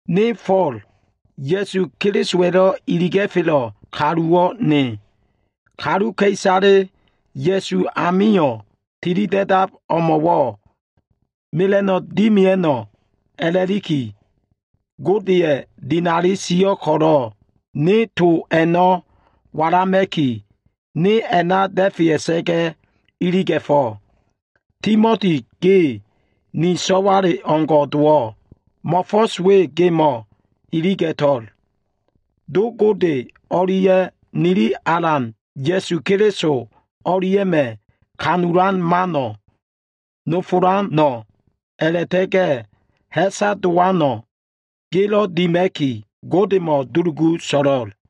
Ne Fo꞉l, Ya꞉su Kelisowa꞉lo꞉ iliga꞉felo꞉ kalu nowo꞉ ne. Kaluka꞉isaleyo꞉ Ya꞉su amilo꞉ tilida꞉dab o꞉mo꞉wo꞉ mela꞉no꞉wo꞉ dimia꞉no꞉ a꞉la꞉liki, Godeya꞉ dinali sio꞉ ko꞉lo꞉ ne to a꞉no꞉ walama꞉ki, ne a꞉na da꞉fea꞉sa꞉ga꞉ iliga꞉fo꞉. Timoti ge, ni so꞉wale o꞉ngo꞉ dowo꞉. Mo꞉fo꞉s we gemo꞉ iliga꞉to꞉l. Do Gode o꞉lia꞉ nili Alan Ya꞉su Keliso o꞉lia꞉ma꞉ ha꞉fo꞉ disa꞉lan mano꞉, nofolano꞉ a꞉la꞉ta꞉ga꞉ ha꞉sa dowano꞉ gelo꞉ dima꞉ki, Godemo꞉ dulugu so꞉lo꞉l.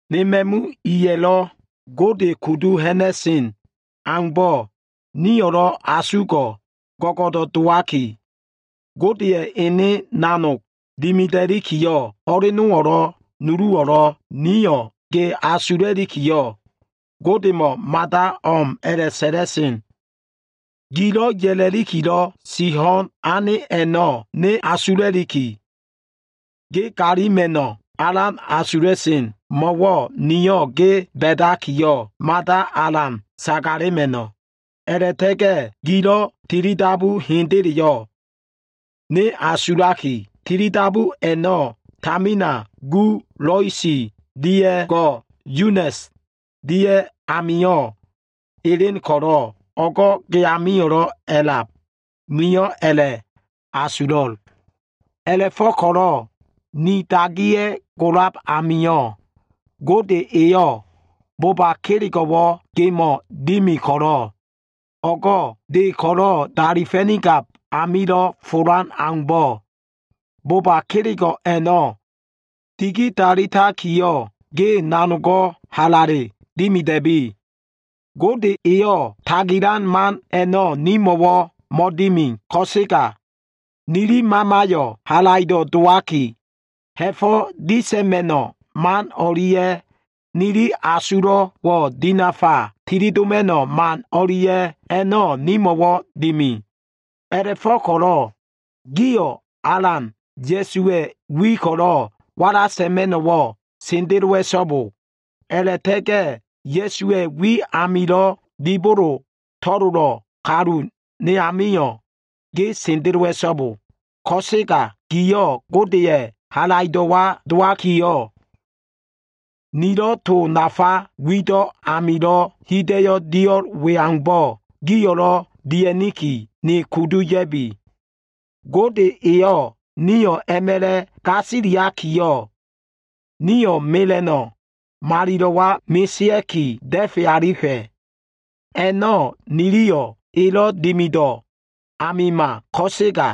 Ne ma꞉mu iya꞉lo꞉ Gode kudu ha꞉na꞉sen aumbo꞉, niyo꞉lo꞉ asugo꞉ go꞉go꞉do꞉ dowaki, Godeya꞉ ene nanog dimida꞉likiyo꞉, ho꞉lenowo꞉lo꞉ nuluwo꞉lo꞉ niyo꞉ ge asula꞉likiyo꞉, Godemo꞉ mada o꞉m a꞉la꞉sa꞉la꞉sen. Gilo꞉ ya꞉lakilo꞉ si ho꞉n ane a꞉no꞉ ne asula꞉liki, ge galima꞉no꞉wo꞉ alan asula꞉sen. Mo꞉wo꞉ niyo꞉ ge ba꞉dakiyo꞉, mada alan sagalema꞉no꞉. A꞉la꞉ta꞉ga꞉ gilo꞉ tilidabu hendeleyo꞉ ne asulakiyo꞉, tilidabu a꞉no꞉ tamina gu Lois dia꞉ go꞉ Yunes dia꞉ amio꞉ elen ko꞉lo꞉, o꞉go꞉ ge amio꞉lo꞉ a꞉lab, niyo꞉ a꞉la꞉asulo꞉l. A꞉la꞉fo꞉ko꞉lo꞉ ni dagiya꞉ golab amio꞉, Gode eyo꞉ boba kelego꞉wo꞉ gemo꞉ dimi ko꞉lo꞉, o꞉go꞉ de ko꞉lo꞉ dalifa꞉nigab amilo꞉ folan aumbo꞉, boba kelego꞉ a꞉no꞉ digidalitakiyo꞉, ge nanogo꞉ halale dimida꞉bi. Gode eyo꞉ tagilan man a꞉no꞉ nimo꞉wo꞉ mo꞉dimi ko꞉sega, nili mamayo꞉ halaido꞉ dowaki, ha꞉fo꞉ disa꞉ma꞉no꞉ man o꞉lia꞉ nili asulo꞉wo꞉ dinafa tilidoma꞉no꞉ man o꞉lia꞉, a꞉no꞉ nimo꞉ dimi. A꞉la꞉fo꞉ko꞉lo꞉ gio꞉ Alan Ya꞉suwa꞉ wi ko꞉lo꞉ wala sa꞉ma꞉no꞉wo꞉ sendelowa꞉so꞉bo. A꞉la꞉ta꞉ga꞉ Ya꞉suwa꞉ wi amilo꞉ dibolo to꞉lolo꞉ kalu ne amio꞉ ge sendelowa꞉so꞉bo. Ko꞉sega giyo꞉ Godeya꞉ halaido꞉wa dowakiyo꞉, nilo꞉ to nafa wido꞉ amilo꞉ hida꞉yo꞉ dio꞉l we aumbo꞉ giyo꞉lo꞉ dia꞉niki, ne kudu ya꞉bi. Gode eyo꞉ nio꞉ a꞉ma꞉la꞉ gasiliakiyo꞉, nio꞉ mela꞉no꞉ malilo꞉wa mesea꞉ki, da꞉fe alifa꞉. A꞉no꞉ niliyo꞉ elo꞉ dimido꞉ amima ko꞉sega,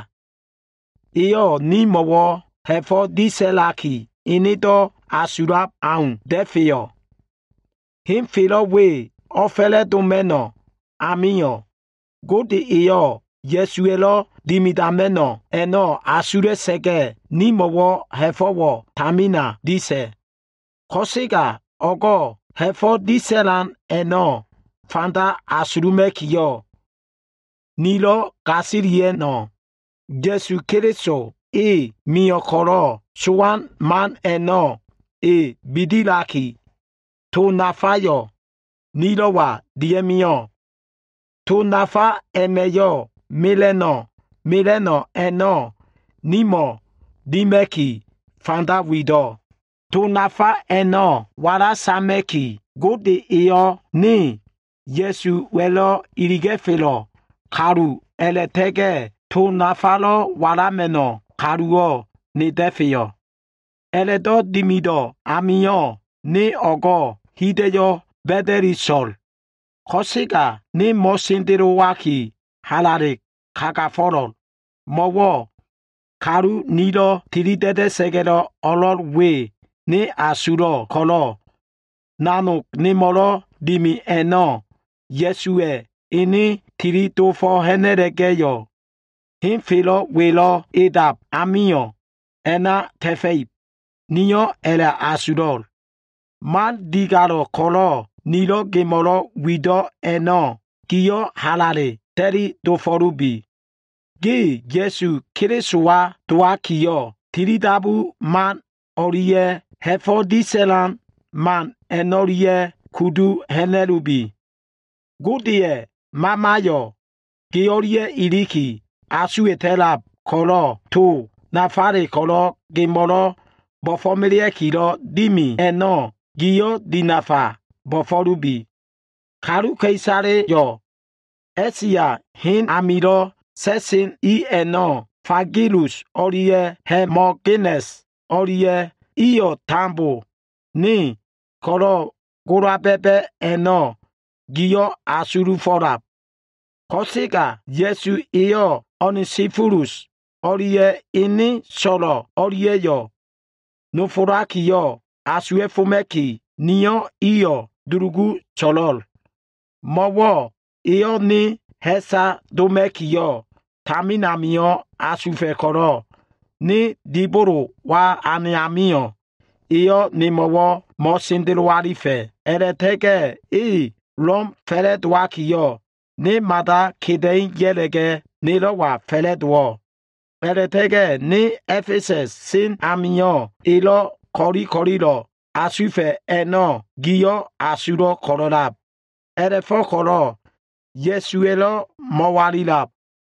eyo꞉ nimo꞉wo꞉ ha꞉fo꞉ disa꞉laki, enedo꞉ asulab au da꞉feyo꞉. Henfelo꞉ we o꞉fa꞉la꞉doma꞉no꞉ amio꞉, Gode eyo꞉ Ya꞉suwa꞉lo꞉ dimidama꞉no꞉ a꞉no꞉ asula꞉sa꞉ga꞉, nimo꞉wo꞉ ha꞉fo꞉wo꞉ tamina disa꞉. Ko꞉sega o꞉go꞉ ha꞉fo꞉ disa꞉lan a꞉no꞉ fanda asuluma꞉kiyo꞉, nilo꞉ gasilia꞉no꞉, Ya꞉su Keliso, e mio꞉ ko꞉lo꞉, sowan man a꞉no꞉ e bidilaki, to nafayo꞉ nilo꞉wa dia꞉mio꞉. To nafa a꞉ma꞉yo꞉ mela꞉no꞉ mela꞉no꞉ a꞉no꞉ nimo꞉ dima꞉ki, fanda wido꞉. To nafa a꞉no꞉ wala sama꞉ki, Gode eyo꞉ ne Ya꞉suwa꞉lo꞉ iliga꞉felo꞉ kaluwo꞉ a꞉la꞉ta꞉ga꞉ to nafalo꞉ walama꞉no꞉ kaluwo꞉ ne da꞉feyo꞉. A꞉la꞉do꞉ dimido꞉ amio꞉ ne o꞉go꞉ hida꞉yo꞉ ba꞉da꞉li so꞉l. Ko꞉sega ne mo꞉sendelowaki halale kagafo꞉lo꞉l. Mo꞉wo꞉ kalu nilo꞉ tilida꞉da꞉sa꞉ga꞉lo꞉ o꞉lo꞉l we ne asulo꞉ ko꞉lo꞉, nanog nemo꞉lo꞉ dimi a꞉no꞉ Ya꞉suwa꞉ ene tili dofo꞉ ha꞉na꞉la꞉ga꞉yo꞉, henfelo꞉ welo꞉ edab ami a꞉na ta꞉fa꞉ib, niyo꞉ a꞉la꞉asulo꞉l. Man digalo꞉ ko꞉lo꞉ nilo꞉ gemo꞉lo꞉ wido꞉ a꞉no꞉, giyo꞉ halale ta꞉li dofo꞉lubi. Ge Ya꞉su Kelisowa dowakiyo꞉, tilidabu man o꞉lia꞉ ha꞉fo꞉ disa꞉lan man a꞉no꞉lia꞉yo꞉ kudu ha꞉na꞉lubi. Godeya꞉ Mamayo꞉ ge o꞉lia꞉ iliki asuwa꞉ta꞉lab ko꞉lo꞉ to nafale ko꞉lo꞉ gemo꞉lo꞉ bo꞉fo꞉melea꞉kilo꞉ dimi a꞉no꞉, giyo꞉ dinafa bo꞉fo꞉lubi. Kaluka꞉isaleyo꞉ A꞉sia hen amilo꞉ sa꞉sen i a꞉no꞉, Figelus o꞉lia꞉ Hemogenes o꞉lia꞉, iyo꞉ tambo ne ko꞉lo꞉ gola ba꞉ba꞉ a꞉no꞉ giyo꞉ asulufo꞉lab. Ko꞉sega Ya꞉su eyo꞉ Onesifolus o꞉lia꞉ ene so꞉lo꞉ o꞉lia꞉yo꞉ nofolaki asuwa꞉foma꞉kiyo꞉, niyo꞉ iyo꞉ dulugu so꞉lo꞉l. Mo꞉wo꞉, eyo꞉ ne ha꞉sa doma꞉kiyo꞉ tamin amio꞉ asufa꞉ ko꞉lo꞉, ne dibolowa ane amio꞉, eyo꞉ nemo꞉wo꞉ mo꞉sendelo alifa꞉. A꞉la꞉ta꞉ga꞉ e Lom fa꞉la꞉dowakiyo꞉, ne mada keda꞉i ya꞉la꞉ga꞉ nelo꞉wa fa꞉la꞉dowo꞉. A꞉la꞉ta꞉ga꞉ ne A꞉fesa꞉s sen amio꞉, elo꞉ ko꞉li ko꞉lilo꞉ asufa꞉ a꞉no꞉, giyo꞉ asulo꞉ ko꞉lo꞉lab. A꞉la꞉fo꞉ko꞉lo꞉ Ya꞉suwa꞉lo꞉ mo꞉walilab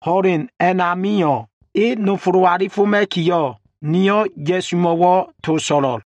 ho꞉len a꞉namio꞉, e nofolo꞉ alifoma꞉kiyo꞉, niyo꞉ Ya꞉sumo꞉wo꞉ to so꞉lo꞉l.